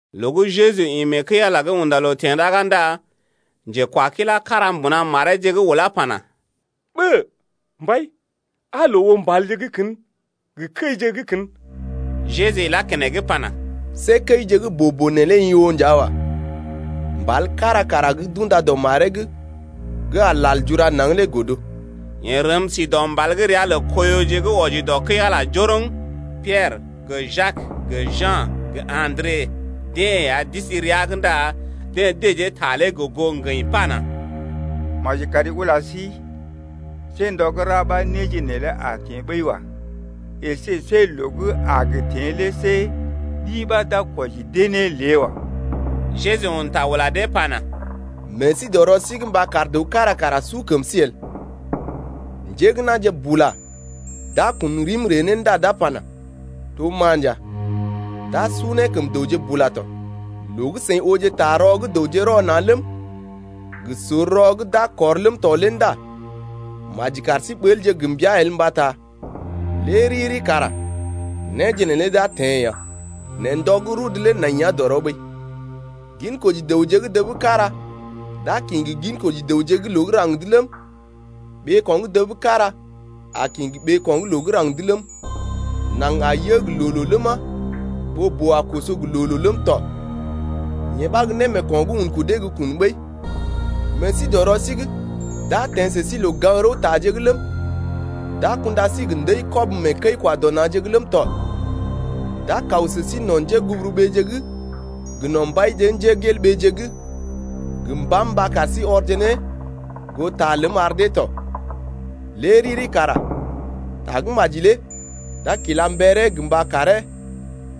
Loo gə́ Jeju ḭ mee kəi-Ala’g unda loo teḛ ɗaga ndá njekwakilá kára mbuna mareeje’g ulá pana: Ɓə! Mbai, aa loo oo mbalje gə́ kən gə kəije gə́ kən! Jeju ilá keneŋ pana: See kəije gə́ boo-boo neelé i oo nja wa. Mbal kára kara gə́ d’unda dɔ maree’g gə́ a lal jura naŋg lé godo. Yeḛ rəm si dɔ mbal gə́ ria lə Koiyoje gə́ wɔji dɔ kəi-Ala njoroŋ. Piɛrə gə Jak gə Ja̰ gə Andre deḛ ya d’isi rəa’g ndá deḛ dəjee ta lé gə goo ŋgəḭ pana: Maji kari ula sí, see ndɔ gə́ ra ɓa néje neelé a teḛ ɓəi wa, əsé see loo gə́ a gə teḛ lé see ɗi ɓa d’a kwɔji dee ne lée wa. Jeju un ta ula dee pana: Meḛ sí dɔ rɔ sí’g mba kar dəw kára kara su kəm sí el. Njé gə́ na̰je bula d’a kun rim ree ne ndá d’a pana: To ma nja. D’a su ne kəm dəwje bula tɔ. Loo gə́ seḭ ooje ta rɔ gə́ dəwje rɔ na̰ ləm, gə sor rɔ gə́ d’a kɔr ləm tɔ lé ndá maji kar sí ɓəlje gə mbəa el mbata lé riri kara néje neelé d’a teḛ ya. Nɛ ndɔ gə́ rudu lé nai ya dɔrɔ ɓəi. Ginkoji dəwje gə́ dəb kára d’a kḭ gə ginkoji dəwje gə́ loo gə́ raŋg’d ləm, ɓeeko̰ gə́ dəb kára a kḭ gə ɓeeko̰ gə́ loo gə́ raŋg’d ləm, naŋg a yə gə loo-loo ləma, ɓoo-boo a koso gə loo-loo ləm tɔ. Yee ɓa gə́ némeeko̰ gə́ un kudee gə́ kun ɓəi. Meḛ sí dɔ rɔ sí’g. D’a teḛ sə sí loo-gaŋg-rəwtaje’g ləm, d’a kunda sí gə ndəi-kɔb mee kəi-kwa-dɔ-na̰je’g ləm tɔ. D’a kaw sə sí no̰ njéguburuɓeeje’g gə no̰ mbaije’g gə mbàm mba kar sí ɔrje ne goo ta ləm ar deeje tɔ. Lé riri kara tagə́maji lé d’a kila mberee gə mba karee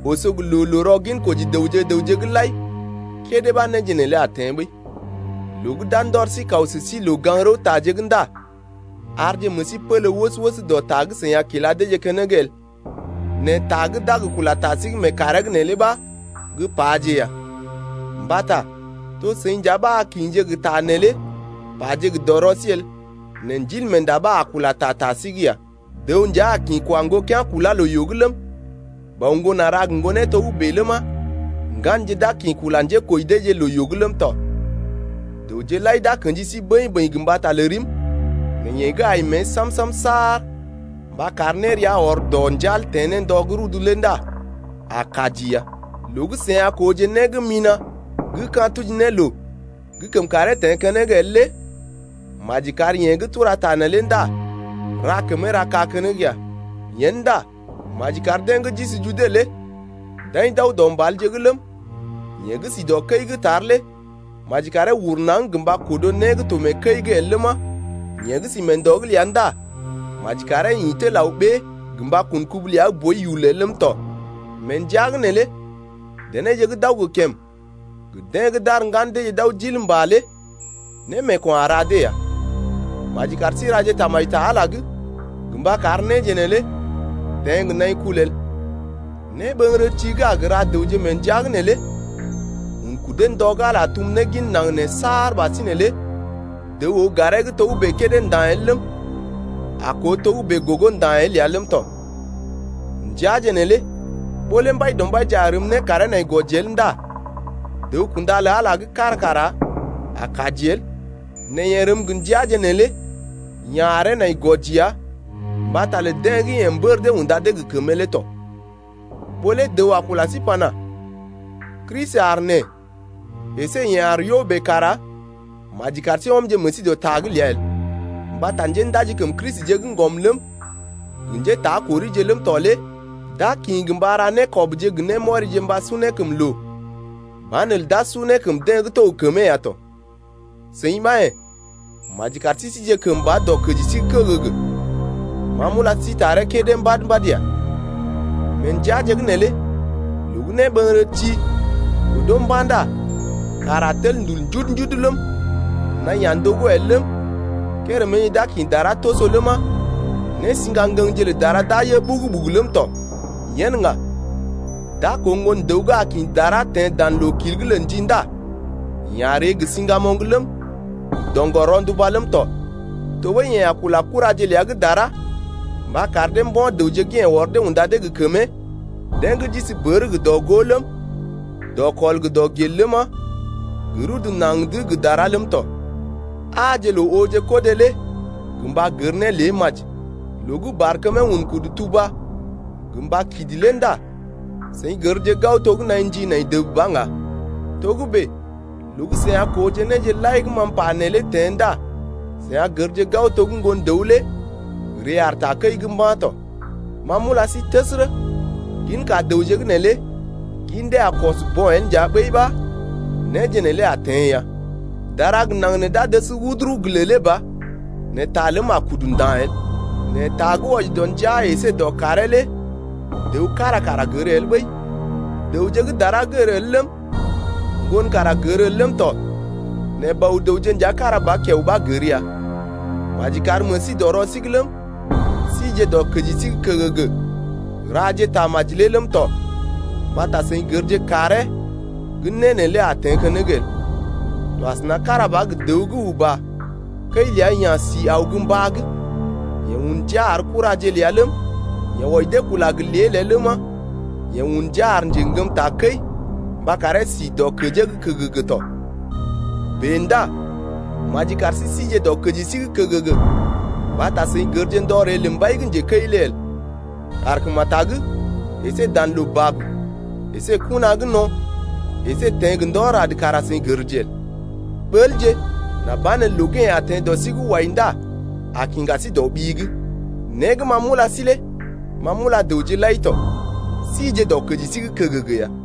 oso gə loo-loo rɔ ginkoji dəwje gə raŋg’g lai kédé ɓa néje neelé a teḛ ɓəi. Loo gə́ d’a ndɔr sí kaw sə sí loo-gaŋg-rəwtaje’g ndá arje meḛ sí pélé wəs-wəs dɔ ta gə́ seḭ a kila deeje keneŋ el, nɛ ta gə́ d’a kula ta sí’g mee kàree’g neelé ɓa gə́ paje ya. Mbata to seḭ nja ɓa a kḭje gə ta neelé paje gə dɔrɔ sí el nɛ Ndilmeenda ɓa a kula ta ta sí’g ya. Dəw nja a kḭ kwa ŋgokea̰ kulá loo-yoo’g ləm, bɔ ŋgon a ra gə ŋgonee togə́bè ləma, ŋganje d’a kḭ kula njékoji deeje loo-yoo’g ləm tɔ. Dəwje lai d’a kḛji sí bəḭ-bəḭ gə mbata lə rim, nɛ yeḛ gə́ ai mée sam-sam saar mba kar nérea ɔr dɔ njal teḛ ne ndɔ gə́ rudu’g lé ndá a kaji ya. Loo gə́ seḭ a kooje né gə́ mina̰ gə́ ka̰ tuji ne loo gə́ kəm karee teḛ keneŋ el lé (maji kar yeḛ gə́ tura ta neelé ndá ra kəmee ra kaa keneŋ ya) yen ndá maji kar deḛ gə́ d’isi Jude lé d’aḭ d’aw dɔ mbalje’g ləm 5yeḛ gə́ si dɔ kəi’g tar lé maji karee uru naŋg gə mba kodo né gə́ to mee kəi’g el ləma, yeḛ gə́ si mee ndɔ’g ləa ndá maji karee ḭ tel aw ɓée gə mba kun kubu ləa gə́ boi yul el ləm tɔ. Mee ndəa’g neelé denéje gə́ d’aw gə kèm, gə deḛ gə́ d’ar ŋgan deeje d’aw d’il mbà lé némeeko̰ a ra dee ya. Maji kar sí raje tamaji ta Ala’g gə mba kar néje neelé teḛ gə nai kul el. Néɓəŋgərəti gə́ a gə ra dəwje mee ndəaje’g neelé un kudee ndɔ gə́ Ala tum ne gin naŋg nee saar ɓasinè lé dəw oo garee gə́ togə́bè kédé nda̰ el ləm, a koo togə́bè gogo nda̰ bèe el ya ləm tɔ. Ndəaje neelé ɓó lé Mbaidɔmbaije a rəm ne karee nai gwɔji el ndá dəw-kunda lə Ala gə́ kára kara a kaji el, nɛ yeḛ rəm gə ndəaje neelé ya̰ aree nai gwɔji ya mbata lə deḛ gə́ yeḛ mbər dee unda dee gə kəmee lé tɔ. Ɓó lé dəw a kula sí pana: Kristi aar nee əsé yeḛ aar yo bèe kara maji kar sí ɔmje meḛ sí dɔ ta’g ləa el. Mbata njéndaji kəm Kristije gə́ ŋgɔm ləm, gə njétakorije ləm tɔ lé d’a kḭ gə mba ra nékɔbje gə némɔrije mba su ne kəm loo, banelə d’a su ne kəm deḛ gə́ to gə kəmee ya tɔ. Seḭ ɓa yḛ̀, maji kar sí sije kəmba dɔ kəji sí’g kəgəgə. Ma m’ula sí taree kédé mbad-mbad ya. Mee ndəaje’g neelé loo gə́ néɓəŋgərəti godo mba̰ ndá kàr a tel ndul njudu-njudu ləm, naḭ a ndogó el ləm 5kéréméje d’a kḭ dara toso ləma, nésḭga ŋgəŋje lə dara d’a yə ɓugu-ɓugu ləm tɔ. Yen ŋga d’a koo Ŋgon-dəw gə́ a kḭ dara teḛ dan loo-kil’g lə ndi ndá yeḛ a ree gə siŋgamoŋ ləm, gə doŋgɔr-ronduba ləm tɔ. Tɔɓəi yeḛ a kula kuraje ləa gə́ dara mba kar dee mbo̰ dəwje gə́ yeḛ ɔr dee unda dee gə kəmee, deḛ gə́ d’isi bər gə dɔ-gó ləm, dɔkɔl gə dɔgel ləma, gə rudu naŋg’d gə dara ləm tɔ. Aaje loo ooje kodé lé gə mba gər ne lé maji. Loo gə́ barkəmee un kudu tuba gə mba kidi lé ndá seḭ gərje gao to gə́ naḭ ndi nai dəb ba ŋga. Togə́bè loo gə́ seḭ a kooje néje lai gə́ ma m’pa neelé teḛ ndá seḭ a gərje gao to gə́ Ŋgon-dəw lé ree aar takəi’g mba̰ tɔ. Ma m’ula sí təsərə, ginka dəwje gə́ nee lé gin dee a kɔs bo̰ el nja ɓəi ɓa néje neelé a teḛ ya. Dara gə naŋg nee d’a dəs wuduru gə lèlé ba, nɛ ta ləm a kudu nda̰ el. Nɛ ta gə́ wɔji dɔ ndəa əsé dɔ kàree lé dəw kára kara gər el ɓəi, dəwje gə́ dara gər el ləm, Ŋgon kara gər el ləm tɔ, nɛ Bɔ-dəwje nja kára ba kiao ɓa gər ya. Maji kar meḛ sí dɔ rɔ sí’g ləm, síje dɔ kəji sí’g kəgəgə raje tamaji lé ləm tɔ, mbata seḭ gərje kàree gə́ né neelé a teḛ keneŋ el. To kára ba asəna gə dəw gə́ uba kəi ləa ya̰ sí aw gə mbá’g. Yeḛ un ndia ar kuraje ləa ləm, yeḛ wɔji dee kula gə lée-lée ləma, yeḛ un ndia ar njeŋgəm takəi mba karee sí dɔkəjee’g kəgəgə tɔ. Bèe ndá maji kar sí síje dɔkəji sí’g kəgəgə mbata seḭ gərje ndɔ ree lə mbai gə́ njekəi lé el. Kàrkemetag əsé dan loo bab əsé gə kona gə́ no̰, əsé teḛ gə ndɔ rad kara seḭ gərje el. Ɓəlje nà banelə loo gə́ yeḛ a teḛ dɔ sí’g wai ndá a kiŋga sí dɔ ɓi’g. Né gə́ ma m’ula sí lé ma m’ula dəwje lai to: sije dɔkəji sí’g kəgəgə ya.